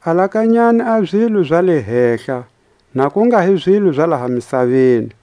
Alakanyani a zilo za le hehla, na ku nga hi zilo za laha misaveni.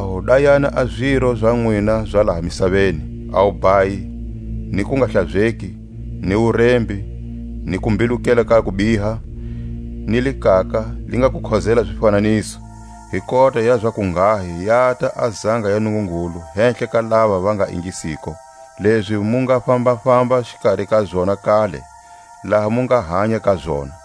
Hikwalaho dayani a ziro za nwina za laha misaveni: a wubhayi, ni kungahlazeki, ni wurembi, ni kumbilukela ka kubiha, ni likaka, li nga kukhozela zifananiso; hi kota ya zakunghahi yata a zanga ya Nungungulu hehla ka lava va nga ingisiko, lezi mu nga fambafamba xikari ka zona kale, laha mu nga hanya ka zona.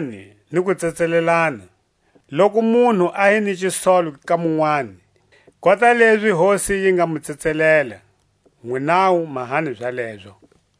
Honiselanani ni ku tsetselelana; loku munhu a hi ni xisolo ka munwani, kota lezi Hosi yi nga mu tsetselela, nwinawu mahani zalezo.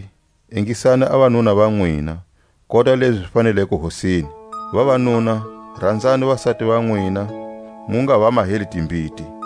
Vavasati, ingisani a vanuna va nwina, kota lezi zi faneleko Hosini. Vavanuna, ranzani vasati va nwina, mu nga va maheli timbiti.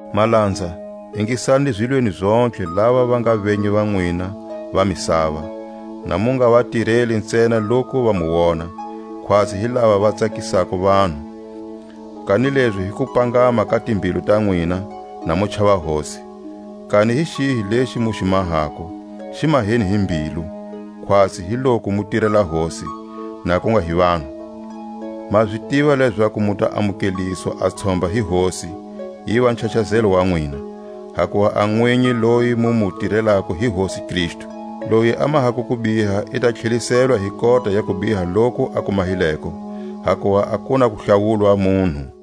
Malanza, ingisani zilweni zontlhe lava va nga venyi va nwina va misava, na mu nga va tireli ntsena loku va mu wona, khwatsi hi lava va tsakisako vanhu, kanilezi hi kupangama ka timbilu ta nwina, na mu chava Hosi. Kani hi xihi lexi mu xi mahako, xi maheni hi mbilu; khwatsi hi loku mu tirela Hosi, na ku nga hi vanhu. Ma zi tiva lezaku mu ta amukeliswa a tshomba hi Hosi, yiva nchachazelo wa nwina; hakuva a nwinyi loyi mu mu tirelako hi Hosi Kristu. Loyi a mahako kubiha i ta tlheliselwa hi kota ya kubiha loku a ku mahileko, hakuva a ku na kuhlawulwa munhu.